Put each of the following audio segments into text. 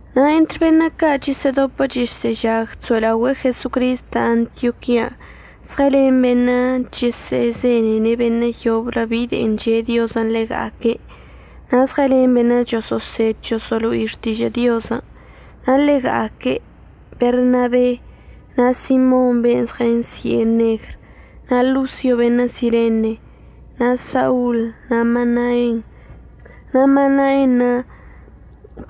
Na' entr beṉə' ca' chəsə'ədopə chəsə'əžag chso'elaogüe'e Jesocristən' Antioquian' zɉəlen beṉə' chəsə'əzenene' beṉə' yoblə bi de'e che'e Diozən' ḻega'aque', na' zɉəlen beṉə' choso'osed choso'olo'ine' xtižə' Diozən'. Na' ḻega'aque' Bernaben', na' Simon ben' zɉənsi'e Negr, na' Losio beṉə' Sirene, na' Saul, na' Manaen. Na' Manaenṉə'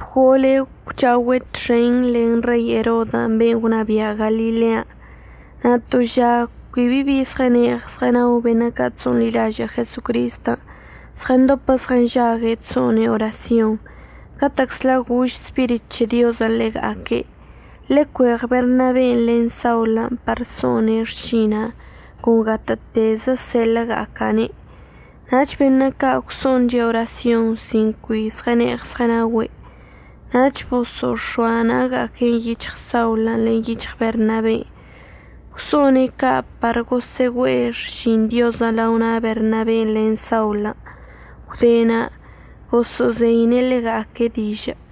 bgolə gwcha'ogüe' txen len Rei Erodən' ben' gwnabia' Galilean'. Na' to ža cui bi zɉəne'eɉ zɉənao beṉə' ca' chso'onḻilažə' Jesocristən', zɉəndopə zɉənžague' chso'one' orasyonṉə'. Catə'əczla gož Spirit c̱he Diozən' ḻega'aque': ―Ḻecueɉ Bernaben' len Saulən' par so'one' xšina'anə' con gatə'ətezə seḻə'əga'aca'ane'. Nach beṉə' ca' gwso'onche' orasyonṉə' sin cui zɉəne'eɉ zɉənaogüe', nach boso'ox̱oa na'aga'aque'enə' yic̱hɉ Saulən' len yic̱hɉ Bernaben'. Gwso'one' ca' par gosə'əgüe'e xšin Diozən' lao na' Bernaben' len Saulən'. Gwde na' boso'ozeine' ḻega'aque' dižə'.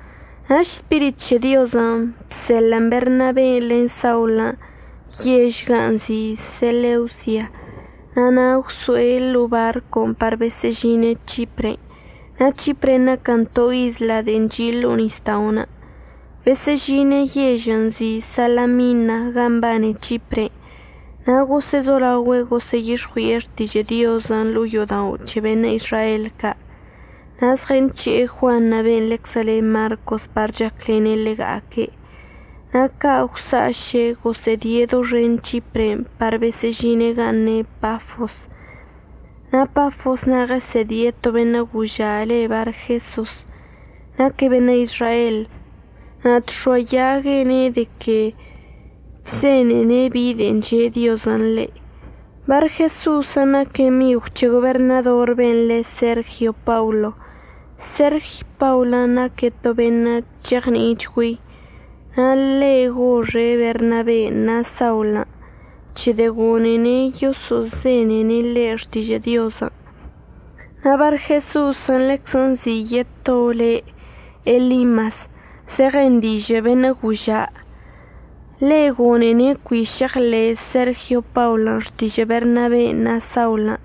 Nach Spirit c̱he Diozən' bseḻə'ən Bernaben' len Saulən' yež gan' nzi' Seleusia. Na' na' gwso'e ḻo'o barcon' par besə'əžine' C̱hipre. Na' C̱hipren' naquən to isla de'en chi' ḻo'o nisda'onə'. Besə'əžine' yežən' nzi' Salamina gan' mbane C̱hipren' na' gosə'əzolaogüe' gosə'əyix̱ɉui'e xtižə' Diozən' ḻo'o yo'odao' c̱he beṉə' Izrael ca'. Na' zɉənc̱he'e Juan ben' ḻeczə le Marcos par chaclene' ḻega'aque'. Na' ca' gwsa'aše' gosə'ədie' doxen C̱hipren' par besə'əžine' gan' ne' Pafos. Na' Pafos na' ɉəsə'ədie' to beṉə' goža' le' Barjesos. Naque' beṉə' Izrael na' chx̱oayague' ne' de que chzenene' bi de'en che' Diozən' ḻe'. Barjesosən' naque' migw c̱he goberṉador ben' le Sergio Paulo. Sergio Paulən' naque' to beṉə' cheɉni'ichgüei. Na' ḻe' goxe' Bernaben' na' Saulən' c̱hedə' gone'ene' yoso'ozenene' ḻe' xtižə' Diozən'. Na' Barjesosən' ḻeczə nzi' yeto le Elimas, zeɉen dižə' beṉə' goža'. Ḻe' gone'ene' cui šeɉḻe' Sergio Paulən' xtižə' Bernaben' na' Saulən'.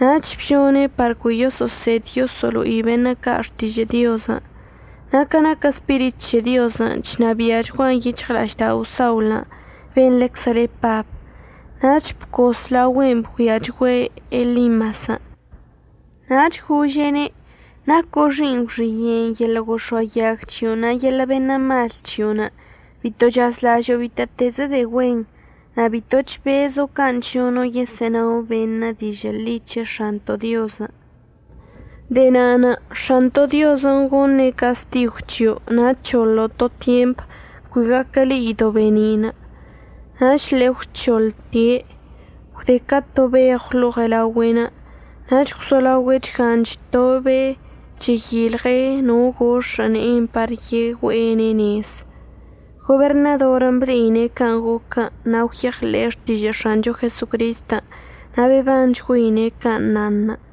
Nach bžone' par cui yoso'osed yoso'olo'i beṉə' ca' xtižə' Diozən'. Na' ca naquə Spirit c̱he Diozən' chnabia'achguan yic̱hɉla'aždao' Saulən', ben' ḻeczə le Pab, nach bcos laogüen' bgüiachgüe' Elimasən'. Nach gože'ene': ―Naco' xi'iṉ gwxiye'enə' yeḻə' gox̱oayag c̱hio'onə' na' yeḻə' beṉə' mal c̱hio'onə'. Bito chazlažo'o bitə'ətezə de'e güenṉə' na' bito chbezo' can' chžono' yesə'ənao beṉə' dižə' ḻi c̱he X̱anto' Diozən'. De'e na'anə' X̱anto' Diozən' goṉe' castigw c̱hio' na' əc̱hoḻo' to tyemp, cui gaquə le'ido' be'eni'inə'. Nach ḻe'e əgwc̱hoḻte', gwde ca to beɉw ḻo'o ɉelaogüe'enə', nach gwzolaogüe' chgan chtobe' cheyilɉe' no gox̱ə' ne'enə' par yegüe'ene' nez. Goberṉadorən' ble'ine' can' goquən' na' gwyeɉḻe'e xtižə' X̱ancho Jesocristən', na' bebanchgüeine' can' nanṉə'.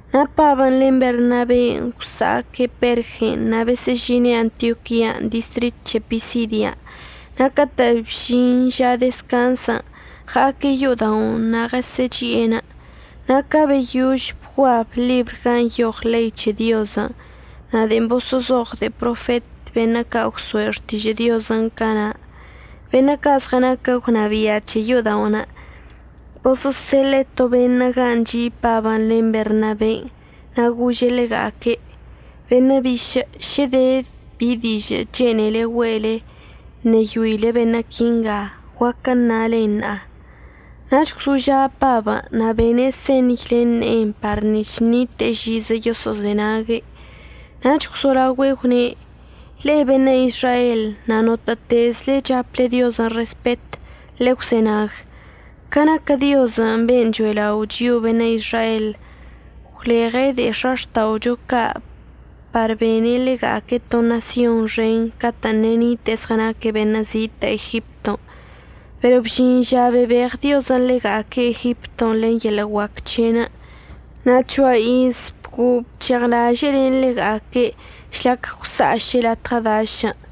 Na' Pabən' len Bernaben' gwsa'aque' Pergen' na' besə'əžine' Antioquian' distrit c̱he Pisidia. Na' catə' bžin ža dezcanzən' ɉa'aque' yo'oda'onə' na' ɉesə'əchi'enə'. Na' ca beyož bguab ḻibr gan' nyoɉ ḻei c̱he Diozən' na' de'en boso'ozoɉ de'e profet beṉə' ca' gwso'e xtižə' Diozən' cana', beṉə' ca' zɉənaquə gwnabia' c̱he yo'oda'onə' boso'oseḻe'e to beṉə' gan' chi' Pabən' len Bernaben' na' gože' ḻega'aque': ―Beṉə' bišə' šə de bi dižə' chene'ele güe'ele əṉeyoile beṉə' quinga, guaquə əṉalen ṉa'a. Nach gwzoža' Pabən' na' bene' señy len ne'enə' par nic̱h ṉite'e žizə yoso'ozenague', nach gwzolaogüe' gwne': ―Ḻe'e beṉə' Izrael na' notə'ətezəchle chaple Diozən' respet, ḻe'e gwzenag. Ca naquə Diozən' ben' cho'elao' chio'o beṉə' Izrael gwleɉe' de'e x̱axta'ocho ca' par bene' ḻega'aque' to ṉasyon xen catə'ən ṉe'e nite'e zɉənaque' beṉə' zitə' Egipton', pero bžin ža bebeɉ Diozən' ḻega'aque' Egipton' len yeḻə' guac c̱he'enə'. Na' ca c̱hoa iz bguo'o bc̱heɉlaže'e len ḻega'aque' žlac gwsa'aše' latɉə dašən'.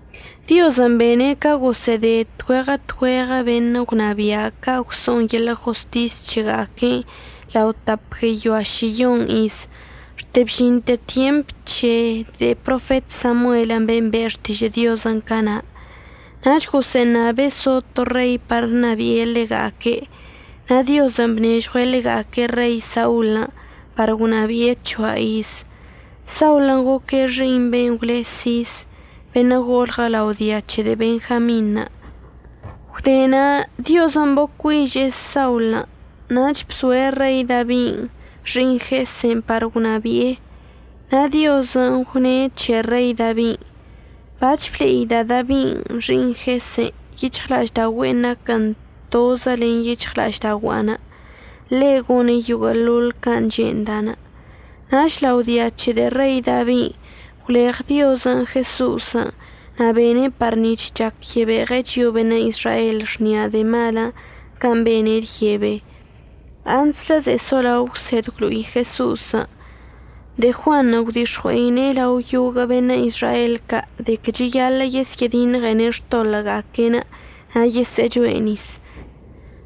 Diozən' bene' ca gosə'əde tgüeɉə tgüeɉə beṉə' gwnabia' ca' gwso'on yeḻə' jostis c̱hega'aque'enə' lao tap gueyoa šiyon iz, xte bžinte tyemp c̱he de'e profet Samuelən' ben' be' xtižə' Diozən' cana'. Nach gosə'əṉabe' so to rei par ṉabi'e ḻega'aque' na' Diozən' bnežɉue' ḻega'aque' Rei Saulən' par gwnabi'e c̱hoa iz. Saulən' goque' xi'iṉ ben' gwle Sis, beṉə' golɉə lao dia c̱he Benjamin. Gwde na' Diozən' bocui'iže'e Saulən' nach bzoe' Rei Dabin' xi'iṉ Jese par gwnabi'e. Na' Diozən' gwne' c̱he Rei Dabin': “Bac̱h ble'ida' Dabi xi'iṉ Jesen', yic̱hɉla'aždaogüe'enə' naquən tozə len yic̱hɉla'aždaogua'anə'. Ḻe' gone' yoguə'əḻoḻ can' che'enda'anə'.” Nach lao dia c̱he Rei Dabin' gwleɉ Diozən' Jeso'osən' na' bene' par nic̱h chac yebeɉe' chio'o beṉə' Izrael xni'a de'e malən' can' bene' lyebe. Antslə ze'e solao əgwsed əgwlo'i Jeso'osən', de'e Juanṉə' gwdix̱ɉui'e lao yoguə' beṉə' Izrael ca' de que cheyaḻə' yesyə'ədiṉɉene' xtoḻə'əga'aque'enə' na' yesə'əchoe' nis.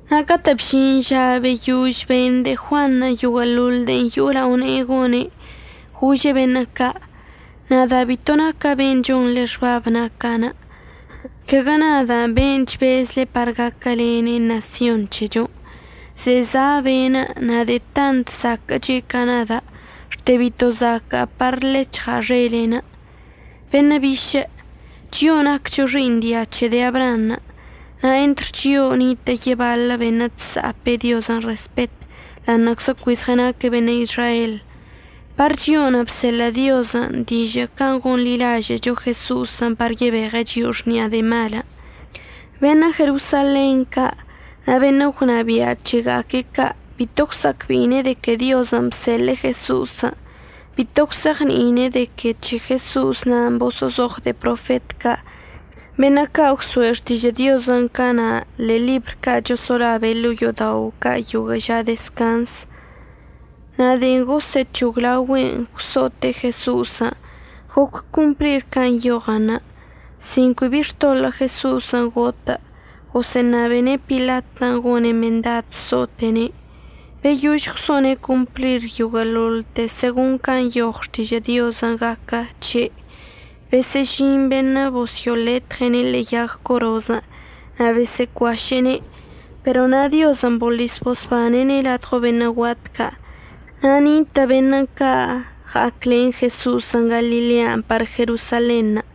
Na' catə' bžin ža beyož ben de'e Juanṉə' yoguə'əḻoḻ de'en yo'o lao ne'e gone', gože' beṉə' ca': “Nada' bito naca' ben' chonḻe xbab naca'. Caguə nada'anə' ben' chbezle par gaquəlene' ṉasyon c̱hechon'. Ze'e za' be'enə' na' de'e tant zaquə'əche' ca nada' xte bito zaca'a par ḻec̱hɉa' xele'enə'.” Beṉə' bišə', chio'o naccho xi'iṉ dia c̱he de'e Abraanṉə' na' entr chio'o nitə' yebaḻə beṉə' chsa'apə Diozən' respet ḻa'aṉə'əczə cui zɉənaque' beṉə' Izrael. Par chio'onə' bseḻə' Diozən' dižə' can' gonḻilažə'əcho Jeso'osən' par yebeɉe' chio'o xni'a de'e malən'. Beṉə' Jerosalen ca' na' beṉə' gwnabia' c̱hega'aque' ca' bito gwsa'acbe'ine' de que Diozən' bseḻe'e Jeso'osən'. Bito gwse'eɉni'ine' de que c̱he Jeso'os nan' boso'ozoɉ de'e profet ca' beṉə' ca' gwso'e xtižə' Diozən' cana' ḻe'e ḻibr ca' choso'olabe' ḻo'o yo'odao' ca' yoguə' ža dezcanz. Na' de'en gosə'əc̱hoglaogüe'en gwso'ote' Jeso'osən' goc complir can' nyoɉən. Sin cui bi xtoḻə' Jeso'osən' gotə', gosə'əṉabene' Pilatən' gone' mendad so'ote'ene'. Beyož gwso'one' complir yoguə'əḻoḻte segon can' nyoɉ Xtižə' Diozən' gaquə c̱he', besə'əžin beṉə' bosyo'oletɉe'ene' ḻe'e yag corozən' na' bosə'əcuaše'ene'. Pero na' Diozən' boḻis bosbane'ene' ladɉo beṉə' guat ca'. Na' nitə' beṉə' ca' əɉa'aclen Jeso'osən' Galilean' par Jerosalenṉə'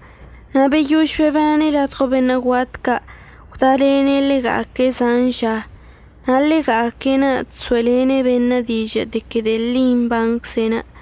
na' beyož bebane' ladɉo beṉə' guat ca' gwdalene' ḻega'aque' zan ža. Na' ḻega'aque'enə' chso'elene' beṉə' dižə' de que de'e ḻi mbancze'enə'.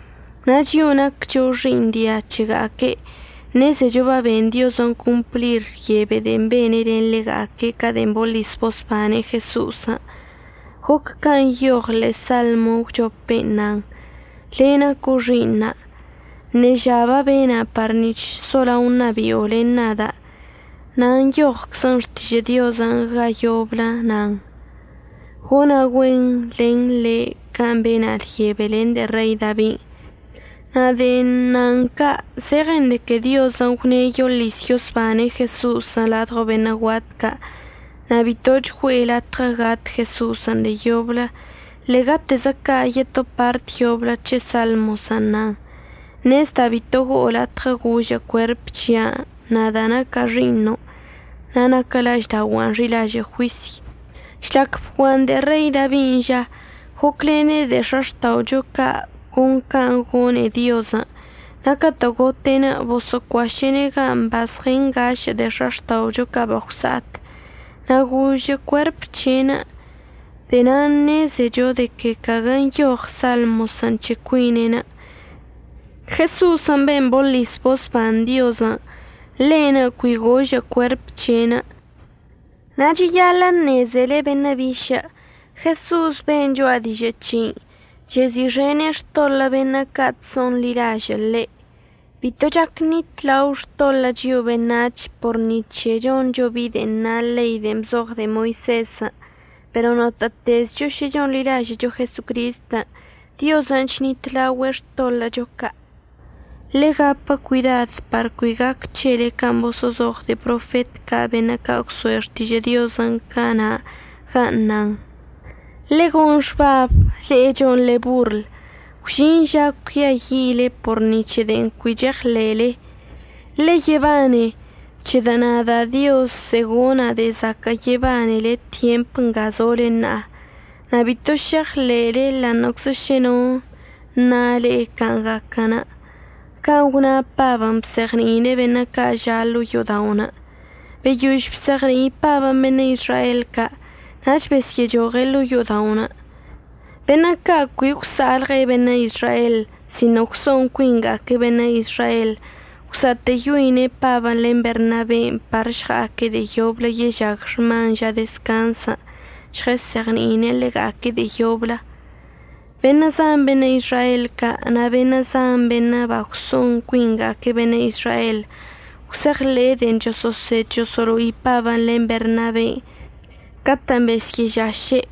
Na' chio'o naccho xi'iṉ dia c̱hega'aque'enə' ṉezecho baben Diozən' complir lyebe de'en bene' len ḻega'aque' ca de'en boḻis bosbane' Jeso'osən'. Goc can' nyoɉən' ḻe'e Salmo əgwchopen' nan: “Le' naco' xi'iṉa'. Ṉeža babena' par nic̱h solao ṉabi'o len nada'.” Na' nyoɉəchczə Xtižə' Diozən' ga yoblə nan: “Gona' güen len ḻe'e can' bena' lyebe len de'e Rei Dabin'.” Na' de'en nan ca' zeɉen de que Diozən' gwne' yoḻis yosbane' Jeso'osən' ladɉo beṉə' guat ca' na' bitoch güe'e latɉə gat Jeso'osən' de'e yoblə. Ḻe'egatezə ca' yeto part yoblə c̱he Salmosən' nan: “Ṉezda' bito go'o latɉə gožə' cuerp c̱hia'anə', nada' naca' xi'iṉo' na' naquə la'aždaogua'anə' xi'ilažə' juisy.” Žlac bguan de'e Rei Dabin' ža, goclene' de'e x̱axta'ocho ca' con can' gone'e Diozən', na' catə' gote' boso'ocuaše'ene' ga bazɉəngašə' de'e x̱axta'ocho ca' bagwsa'at, na' gožə' cuerp c̱he'enə'. De'e na'anə' ṉezecho de que caguə nyoɉ Salmosən' c̱he cuine'en. Jeso'osən' ben' boḻis bosban Diozən', ḻe'enə' cui gožə' cuerp c̱he'enə'. Na' cheyaḻə' əṉezele beṉə' bišə', Jeso'osən' ben' cho'a dižə' c̱hei chezi'ixene' xtoḻə' beṉə' ca' chso'onḻilažə' ḻe'. Bito chac ṉitlao xtoḻə' chio'o beṉac̱h por ni c̱he choncho bi de'en na ḻei de'en bzoɉ de'e Moisezən', pero notə'ətezcho šə chonḻilažə'əcho Jesocristən', Diozən' chnitlaogüe' xtoḻə'əcho ca'. Ḻe'e gapə cuidad par cui gac c̱hele can' boso'ozoɉ de'e profet ca' beṉə' ca' gwso'e xtižə' Diozən' cana' gan' nan: Ḻe'e gon xbab, le'e chonḻe borl, gwžin ža cuiayi'ile por ni c̱he de'e cui cheɉḻe'ele. Ḻe'e yebane, c̱hedə' nada' Dioz ze'e gona' de'e zaquə' yebanele tyemp nga zole ṉa'a, na' bito šeɉḻe'ele ḻa'aṉə'əczə šə no əṉa le'e can' gaquən'. Can' gwna Pabən' bzeɉni'ine' beṉə' ca' ža' ḻo'o yo'oda'onə'. Beyož bzeɉni'i Pabən' beṉə' Izrael ca' nach besyə'əchoɉe' ḻo'o yo'oda'onə'. Beṉə' ca' cui gwsa'alɉe' beṉə' Izrael sino gwso'on cuinga'aque' beṉə' Izrael gwsa'atə'əyoine' Pabən' len Bernaben' par əžɉa'aque' de'e yoblə yežag xman ža dezcanzən' žɉəsə'əzeɉni'ine' ḻega'aque' de'e yoblə. Beṉə' zan beṉə' Izrael ca' na' beṉə' zan beṉə' bagwso'on cuinga'aque' beṉə' Izrael gwse'eɉḻe'e de'en choso'osed choso'olo'i Pabən' len Bernaben' catə'ən besyə'əžaše'.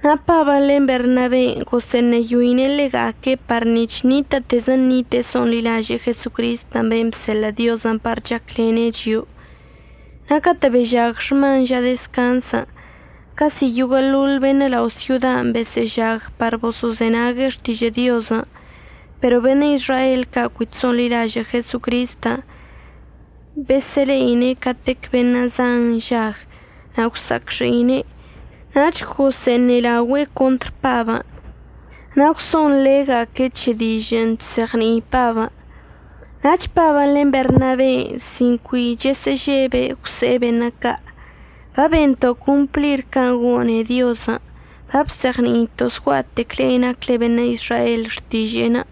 Na' Pabən' len Bernaben' gosə'əṉeyo'ine' ḻega'aque' par nic̱h ṉitə'ətezə ṉite'e so'onḻilaže'e Jesocristən' ben' bseḻə' Diozən' par chaclene' chio'o. Na' catə' bežag xman ža dezcanzən', casi yoguə'əḻoḻ beṉə' lao' syodan' besə'əžag par boso'ozenague' xtižə' Diozən'. Pero beṉə' Izrael ca' cui chso'onḻilažə' Jesocristən' besə'əle'ine' catec beṉə' zanṉə' nžag na' gwsa'acxi'ine', nach gosə'əṉelaogüe' contr Pabən' na' gwso'onḻe'ega'aque' c̱he dižə'ən chzeɉni'i Pabən'. Nach Pabən' len Bernaben' sin cui chəsə'əžebe' gwse'e beṉə' ca': ―Babento' complir can' gone'e Diozən' babzeɉni'ito' zgua'atec le'e nacle beṉə' Izrael xtiže'enə'.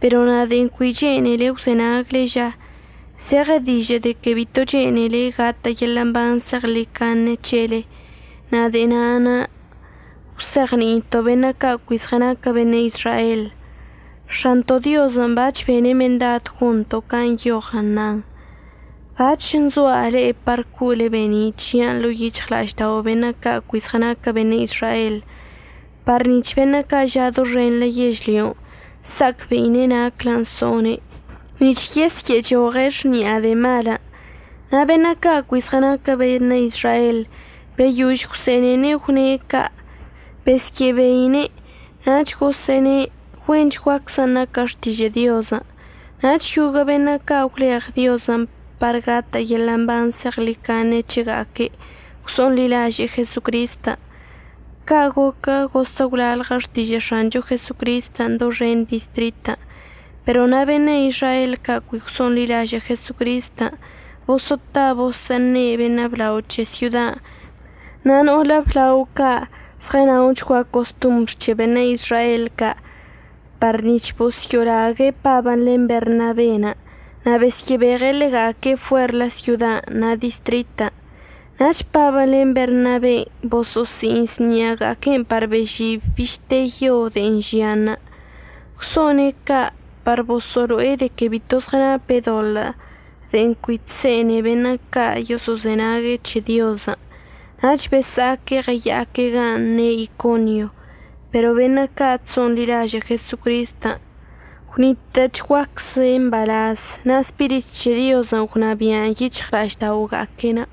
Pero na' de'en cui chene'ele əgwzenagle ža, zeɉe dižə' de que bito chene'ele gatə' yeḻə' mban zeɉḻicaṉe c̱helen' na' de'e na'anə' əgwzeɉni'ito'on beṉə' ca' cui zɉənaquə beṉə' Izrael. X̱anto' Diozən' bac̱h bene' mendad gonto' can' nyoɉən nan: Bac̱h nzoa' le'e par co'ole be'eni' c̱hia'anə' ḻo'o yic̱hɉla'aždao' beṉə' ca' cui zɉənaquə beṉə' Izrael par nic̱h beṉə' ca' ža' doxenḻə yežlyon' əsa'acbe'ine' naclən so'one' nic̱h yesyə'əchoɉe' xni'a de'e malən'. Na' beṉə' ca' cui zɉənaquə beṉə' Izrael beyož gwse'ene'ene' gwne' ca' besyə'əbeine' nach gosə'əne' güenchguaczən' naquə xtižə' Diozən'. Nach yoguə' beṉə' ca' bagwleɉ Diozən' par gatə' yeḻə' mban zeɉḻicaṉe c̱hega'aque'enə' gwso'onḻilaže'e Jesocristən'. Ca' goquə gosə' gwlalɉə xtižə' X̱ancho Jesocristən' doxen distritən'. Pero na' beṉə' Izrael ca' cui gwso'onḻilažə' Jesocristən' boso'ota boso'oṉe' beṉə' blao c̱he syodan' na' no'olə əblao ca' zɉənaochgua costombr c̱he beṉə' Izrael ca' par nic̱h bosyo'olague' Pabən' len Bernaben' na' besyə'əbeɉe' ḻega'aque' fuer syodan' na' distritən'. Nach Pabən' len Bernaben' boso'osi'iṉs ṉi'aga'aquen' par bežib bište yon' de'en žianṉə'. Gwso'one' ca' par boso'olo'e de que bito zɉənape' doḻə' de'en cui chse'ene beṉə' ca' yoso'ozenague' c̱he Diozən', nach besa'aque' ɉəya'aque' gan' ne' Iconio. Pero beṉə' ca' chso'onḻilažə' Jesocristən' gwnitə'əchguacze' mbalaz, na' Spirit c̱he Diozən' gwnabia'an yic̱hɉla'ažda'oga'aque'enə'.